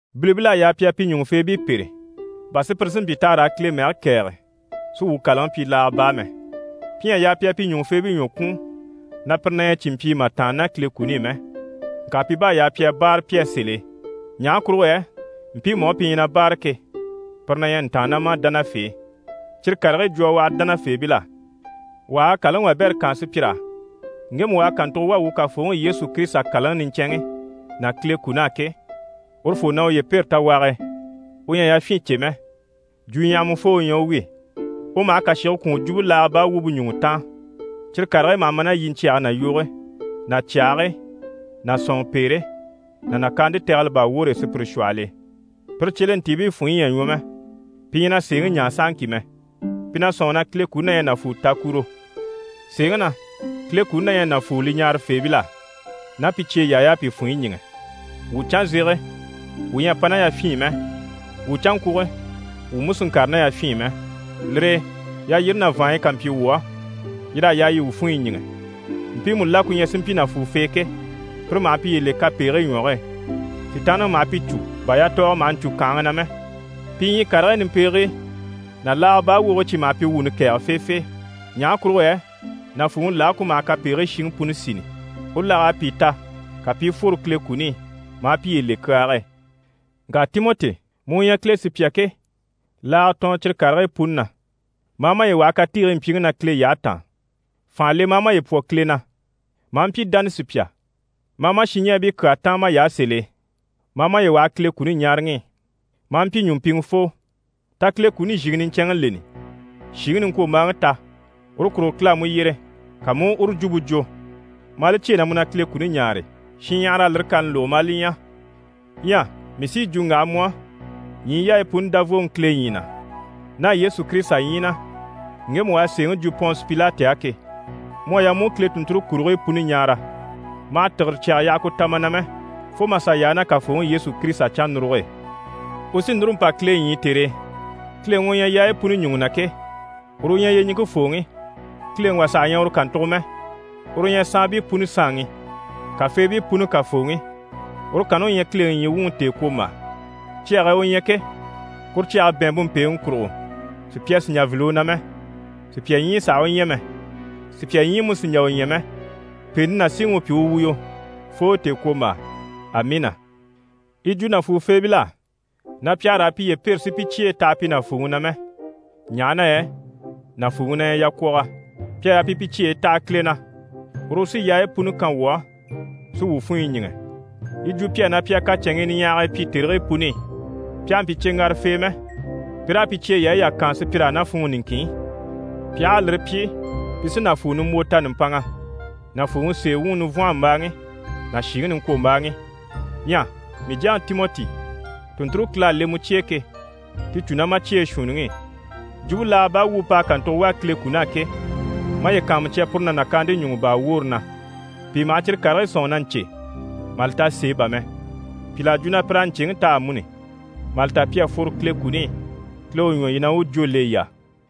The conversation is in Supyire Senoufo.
Bilibil'à yaa pi a pi ɲùŋufeebii pêre, bà sùpyire si mpyi t'àha raa Kile mɛge kɛ̀ɛge, si wuu kàlaŋi pyi laaga baa mɛ. Pi ɲyɛ a yaa pi a pi ɲùŋufeebii ɲwɔ kwùun, na pire na ɲyɛ cìnmpyii mà tàanna ná Kile kuni i mɛ. Ŋka pi bá à yaa pi a báare pi á sèl'e, ɲaha kurugo yɛ mpiimu á pi ɲyɛ na báare ke, pire na ɲyɛ ntàannamadanafee. Cyire karigii jwo a waha dánafeebil'á. Wà ha a kàlaŋi wabɛrɛ kaan sùpyir'á ŋgemu u à kàntugo wà wuu Kafooŋi Yesu Kirisita kàlaŋi niɲcɛnŋi ná Kile kun'á ke, urufoo na uye pêre tawage e, u ɲyɛ a yafyin cè mɛ. Jwuɲyahamafoo u ɲyɛ u wi. U maha kàshige kwùun jwumpe laaga baa wumpe ɲùŋɔ taan, cyire karigii maha ma ná yiɲcyɛge ná yoge ná cyàhigii ná sɔ̀nŋɔpeere ná nàkaante tɛgɛlɛ baa woore e sùpyire shwɔhɔl'e. Pire cyelentiibii funɲyi ɲyɛ a ɲwɔ mɛ, pi ɲyɛ na sèeŋi ɲaa sahaŋki mɛ. Pi na sɔ̂nŋi na Kile kuni na ɲyɛ nàfuutakuro. Sèeŋi na, Kile kuni na ɲyɛ nàfuu li ɲaarafeebil'á, ná pi cyeyaay'à pi funɲyi ɲíŋɛ. Wuu canzege, wuu ɲyɛ a pa ná yafyin i mɛ, wuu canŋkwuge wuu mú sì n‑kàre ná yafyin i mɛ. Lire e yalyire ná vàanɲyi ká mpyi wuu á, yir'à yaa yi wuu funɲyi ɲíŋɛ. Mpiimu la ku ɲyɛ si mpyi nàfuufee ke, pire maha piye le kapegigii ɲwɔge e. Sitaanniŋi maha pi cû bà yatɔɔgɔ maha ɲcû kànhaŋa na mɛ. Pi ɲyii karigii nimpegigii ná laaga baa wogigii cyi maha pi wuuni kɛ̀ɛgɛ feefee. Ɲaha kurugo yɛ nàfuuŋi lage ku maha kapegigii shiŋi puni sini, u lag'à pìi ta, ka pi i fworo Kile kuni i, maa piye le kyaage e. Ŋka Timɔti, mu u ɲyɛ Kile sùpya ke, laaga tɔɔn cyire karigii puni na, ma a maye waha katiigii mpyiŋi na Kile yyahe taan. Fànha le ma a maye pwɔ Kile na, ma a mpyi dánasupya, ma a ma shinɲɛɛbii kyaa táan may'á sèl'e, ma a maye waha Kile kuni ɲaaraŋi i, ma a mpyi ɲùmpiŋɛfoo. Ta Kile kuni zhìŋi niɲcɛnŋi leni. Shìŋi niŋkwombaaŋi ta, uru kurugo Kile à mu yyere, ka mu u uru jwumpe jwo, maa li cyêe na mu na Kile kuni ɲaare, shinɲyahara a lire kani lógo maa li ɲya. Ɲyɛ mii sí yi jwo n‑waha mu á, ɲyii yaayi puni Davooŋi Kile ɲyii na ná Yesu Kirisita ɲyii na, ŋgemu u à sèeŋi jwo Pɔnse Pilati á ke, mu à yaa mu u Kile tùnnture kurigii puni ɲaara. Ma hà tìgire cyaga yaha ku ta ma na mɛ, fo mà sà yaa ná Kafooŋi Yesu Kirisita cannuruge e. U sí núru n‑pa Kile ɲyii tère e, Kileŋi u ɲyɛ yaayi puni ɲùŋɔ na ke, uru u ɲyɛ yyeɲiŋke fooŋi, kileŋi wà saha ɲyɛ uru kàntugo mɛ, uru u ɲyɛ saanbii puni Saanŋi, kafeebii puni Kafooŋi. Uru kanni u ɲyɛ Kileŋi ɲyii wuŋi tèekwombaa; cyage e u ɲyɛ ke, kuru cyage bɛ̀ɛnmpe mpèeŋi kurugo, sùpya sì n‑jà n‑file u na mɛ, sùpya ɲyii sàha u ɲya mɛ, sùpya ɲyii mú sì n‑jà u ɲya mɛ. Pèente ná síŋi u pyi u wuyo, fo tèekwombaa. Amiina! Yi jwo nàfuufeebil'á na pi àha raa piye pêre si pi cyeyi taha pi nàfuuŋi na mɛ, ɲaha na yɛ nàfuuŋi na ɲyɛ yakwɔgɔ. Pi à yaa pi pi cyeyi taha Kile na, uru u sí yaayi puni kan wuu á, si wuu funɲyi ɲíŋɛ. Yi jwo pi á na pi a kacɛnŋii niɲyahagii pyi tèrigii puni i, pi àha mpyi cyeŋgarafee mɛ, pi raa pi cyeyaayi yà kaan sùpyir'á ná funŋɔ niŋkinŋi i. Pi aha a lire pyi, pi sí nàfuu nimbwo ta nùmpanŋa, nàfuuŋi sèe wuŋi nivwɔnhɔmbaaŋi ná shìŋi niŋkwombaaŋi. Ɲyɛ mii jyaŋi Timɔti, tùnnture Kile à le mu cye e ke, ti cû ná ma cyeyi shuunniŋi i. Jwumpe laaga baa wumpe p'à kàntugo wà Kile kun'á ke, maye kàanmucya puru ná nàkaante ɲùŋɔ baa woore na. Pìi maha cyire karigii sɔ̂nŋi na ɲcè, mà li ta sèe bà mɛ. Pìl'à jwo na pir'à ɲcèŋi ta amuni, mà li ta pi à fworo Kile kuni i. Kile u ɲwɔ yii na, u u jwó le yii á.